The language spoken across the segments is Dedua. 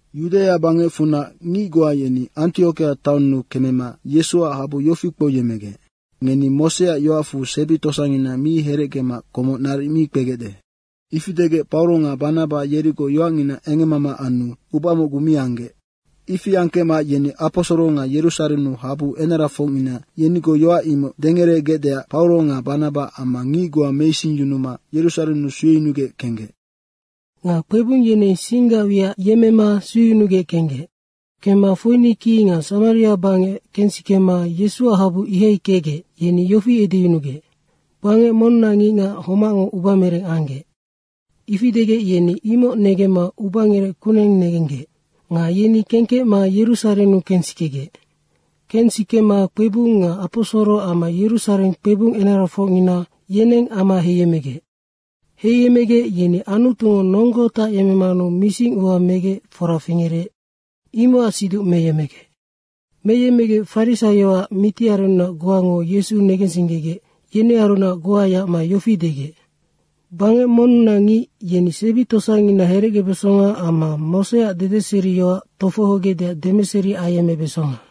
Yudaia bangecfunac ngic goa yeni Antiokia taonnu kemema Yesuac habu yofi kpouyemmegec, “Ngeni Moseac yoacfu sebi tosangina mi herecgema komoc naric mi kpegecde.” Ifi degec Pauro nga Banaba yerigoc yoacngina engemmama anu uba mocgu mi anggec. Ifi angkecma yeni aposoro nga Yerusarennu habu enarafocngina yenigoc yoac imoc dengeregecdeac Pauro nga Banaba amma ngic goa meisingyunuma Yerusarennu sueyunugec kenggec. Nga kpebung yeneng singgac wiac yemmema sueyunugec kenggec. Kemma Foinike nga Samaria bangec kensikema Yesuac habu ihai kecgec, yeni yofi edeyunugec, “Bangec monnunac ngicngac homacngo ubamereng anggec.” Ifi degec, yeni imoc negemma ubangerec kuneng negenggec. Nga yeni kengkecma Yerusarennu kensikegec. Kensikema kpebung nga aposoro amma Yerusareng kpebung enarafocngina, yeneng ama heiyemmegec. Heiyemmegec, yeni Anutungo nonggo tacyemmemanu misingua megec fora fingerec, imocac siduc meyemmegec. Meyemmegec farisaioac mitiarennunac goango Yesu negensinggegec, yenearunac goa yacma yofi degec, “Bangec monnunac ngic yeni sebi tosangina herecgebesonga amma Moseac dedeseriyoac tofohogecdeac demeseri ayemmebesonga.”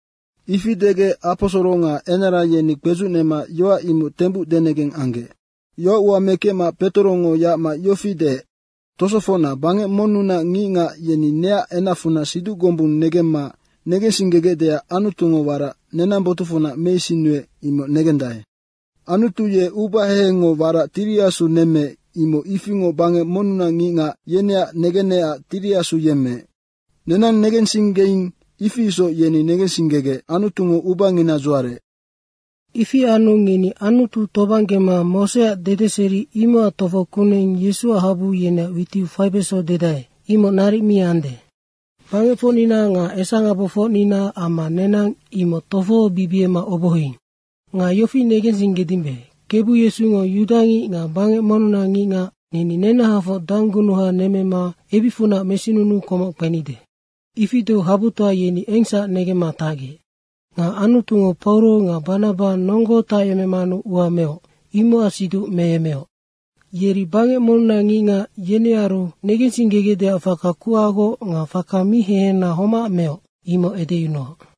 Ifi degec aposoro nga enara yeni kpedzucnema yoac imoc tembuc denegeng anggec. Yoacua mekecma Petorongo yacma yofi deec, “Tosofocna, bangec monnunac ngicngac, yeni neac enacfunac siduc gombung negemma negensinggegecdeac Anutungo warac nenang botucfunac meisinnuec, imoc negendae. Anutu ye uba hehengngo warac Tiri Asu nemmeec, imoc ifingoc bangec monnunac ngicngac, yeneac negenecac Tiri Asu yemmeec. Nenang negensinggeing, ifi isoc yeni negensinggegec Anutungo ubangina dzuarec. Ifi anu ngeni Anutu tobanggema Moseac dedeseri, imocac tofo kuneng Yesuac habu yeneac witiu faibeso dedae, imoc naric mi ande. Bangecfocnina nga esangabofocnina amma nenang imoc tofobibiema obohoing. Nga yofi negensinggedimbe, Kebu Yesungo yudangic nga bangec monnunac ngicngac, neni nenahafoc danggunuha nemmema ebicfunac mesinunuu komoc kpenide.” Ifi deu habutoa yeni engsac negemma tacgec. Nga Anutungo Pauro nga Banaba nonggo tacyemecmanu ua meoc, imocac siduc meyemmeoc. Yeri bangec monnunac ngicngac, yenearu negensinggegecdeac faka kuhagoc nga faka mi hehena homac meoc, imoc edeyunuoc.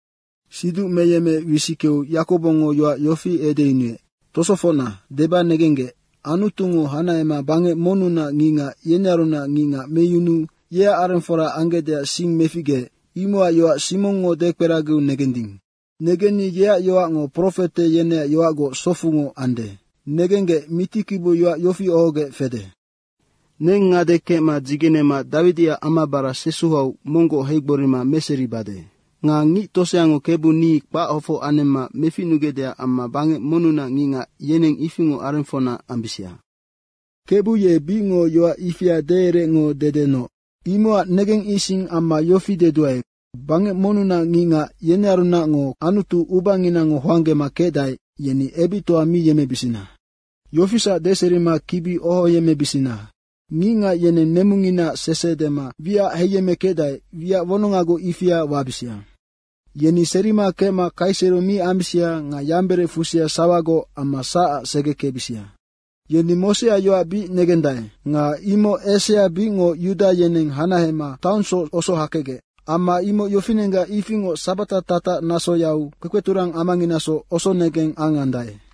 Siduc meyemmeec wisickeu Yakobongo yoac yofi edeyunuec, “Tosofocna, deba negenggec, Anutungo hanahema bangec monnunac ngicngac, yenearunac ngicngac meyunuu yeac arengfora anggecdeac sing meficgeec, imocac yoac Simongngo dekperagiu negending. Negenni yeac yoacngo profete yeneac yoacgoc socfungoc ande. Negenggec, mitikibiu yoac yofi ohogec fede. ‘ “Neng ngade kecma dzigenema Dawidiac amabara sesuhau monggoc heigborima meseribade. Nga ngic toseango Kebu ni kpachofoc anemma meficnugecde amma bangec monnunac ngicngac, yeneng ifingoc arengfocna ambisia.” Kebu ye bicngoc yoac ifia deereecngo dedenoc.’ Imocac negengising amma yofi deduae, bangec monnunac ngicngac, yenearunacngo Anutu ubanginango hoanggema kecdae, yeni ebictoa mi yemmebisina. Yofisac deserima kibi ohoyemmebisina, ngicngac yeneng nemunginaac sese dema wiac heiyemmekecdae, wiac wonongagoc ifia wabisia. Yeni serima kecma kaisero mi ambisia nga yamberec fusia sawagoc amma sacac segekecbisia. Yeni Moseac yoac bic negendae. Nga imoc esea bicngoc yuda yeneng hanahema taonsoc osohakecgec. Amma imoc yofinenggac ifingoc sabata tatac nasoyau kpekpeturang amanginasoc osonegeng angandae.”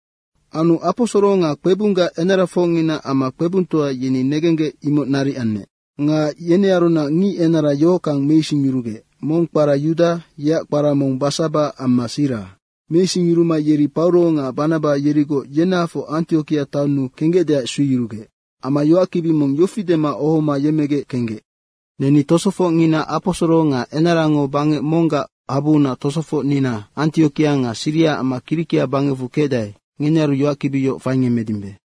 Anu aposoro nga kpebunggac enarafocngina amma kpebungtoa, yeni negenggec imoc naric anec. Nga yenearunac ngic enara yohockang meisingyurugec mong kpara Yuda, yeac kpara mong Basaba, amma Sira. Meisingyuruma yeri Pauro nga Banaba yerigoc yenahafoc Antiokia taonnu kenggecdeac sueyurugec. Amma yoackibi mong yofi dema ohoma yemmegec kenggec, “Neni tosofocngina aposoro nga enarango bangec monggac habuunac tosofocnina Antiokia nga Siria amma Kirikia bangecfu kecdae, ngenearu yoackibi yoc faingemmedimbe.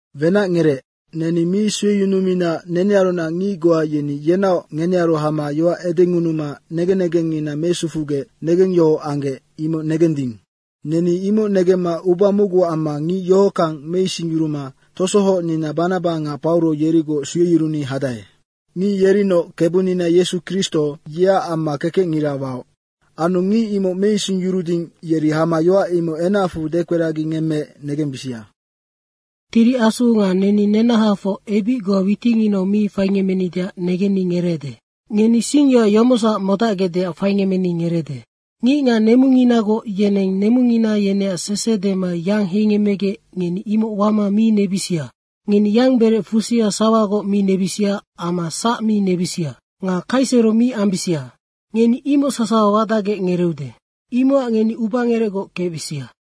Wenacngerec. Neni mi sueyunumina nenearunac ngic goa yeni yenaoc ngenearu hama yoac edengunuma negen negengngina mesufugec negengyohoc anggec, imoc negending. Neni imoc negemma uba mocgu amma ngic yohockang meisingyuruma tosohocnina Banaba nga Pauro yerigoc sueyuruni hadae. Ngic yerinoc Kebunina Yesu Kristo, yeac amma kekecngira waoc. Anu ngic imoc meisingyuruding, yeri hama yoac imoc enacfu dekperagingemmeec negembisia. Tiri Asu nga neni nenahafoc ebic goa witinginau mi faingemmenideac negenni ngereede. Ngeni singyoac yomocsac modacgecdeac faingemmeni ngereede: Ngicngac nemunginagoc yeneng nemungina yeneac sese dema yang heiyemmegec, ngeni imoc wama mi nebisia. Ngeni yamberec fusia sawagoc mi nebisia amma sac mi nebisia. Nga kaisero mi ambisia. Ngeni imoc sasawa wadacgec ngereeude. Imocac ngeni ubangerecgoc kecbisia.”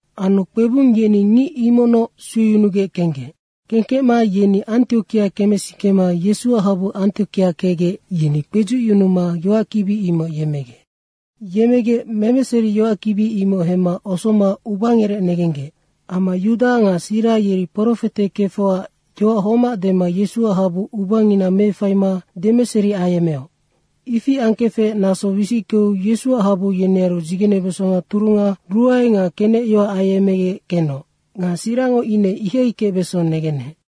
Anu kpebung yeni ngic imocnoc sueyunugec kenggec. Kengkecma yeni Antiokia kemesikema Yesuac habu Antiokia kecgec, yeni kpedzucyunuma yoackibi imoc yemmegec. Yemmegec memeseri yoackibi imoc hemma osoma ubangerec negenggec. Amma Yuda nga Sira yeri profete kefocac yoac homac dema Yesuac habu ubangina meefaima demeseri ayemmeoc. Ifi angkefec naso wisickeu Yesuac habu yenearu dzigenebesonga turunga ruae nga kenecyoac ayecmegec kenoc. Nga Sirango ine ihai kecbeso negenec.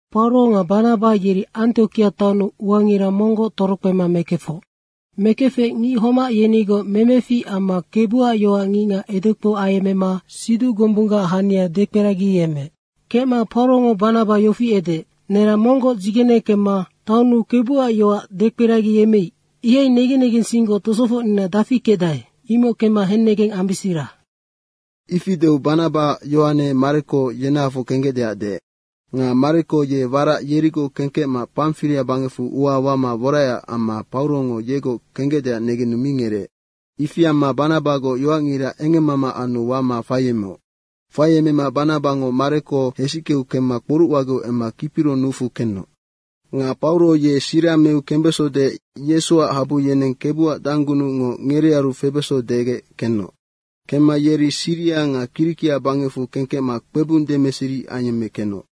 Pauro nga Banaba yeri Antiokia taonnu uangira monggoc torokpema mekefoc. Mekefec ngic homac yenigoc memefic amma Kebuac yoac ngicngac edekpou ayemmema siduc gombunggac hania dekperagiyemmeec. Kecma Paurongo Banaba yofi edeec, “Nerang monggoc dzigene kemma taonnu Kebuac yoac dekperagiyemmeic, ihai negen negensinggoc tosofocnina dafi kecdae, imoc kemma hennegeng ambisira.” Ifi deu Banabango Yohane Mareko yenahafoc kenggecdeac deec. Nga Mareko ye warac yerigoc kengkecma Pamfiria bangecfu ua wama woraecac amma Paurongo yegoc kenggecdeac negenu mi ngereec. Ifi amma Banabagoc yoacngira engemmama anu wama faiemeoc. Faiemema Banabango Mareko hesickeu kemma kporucwageu emma Kipiro nucfu kenoc. Nga Pauro ye Sira meu kembeso deec Yesuac habu yeneng Kebuac danggunucngo ngerearu febeso degec kenoc. Kemma yeri Siria nga Kirikia bangecfu kengkecma kpebung demeseri ayemmekenoc.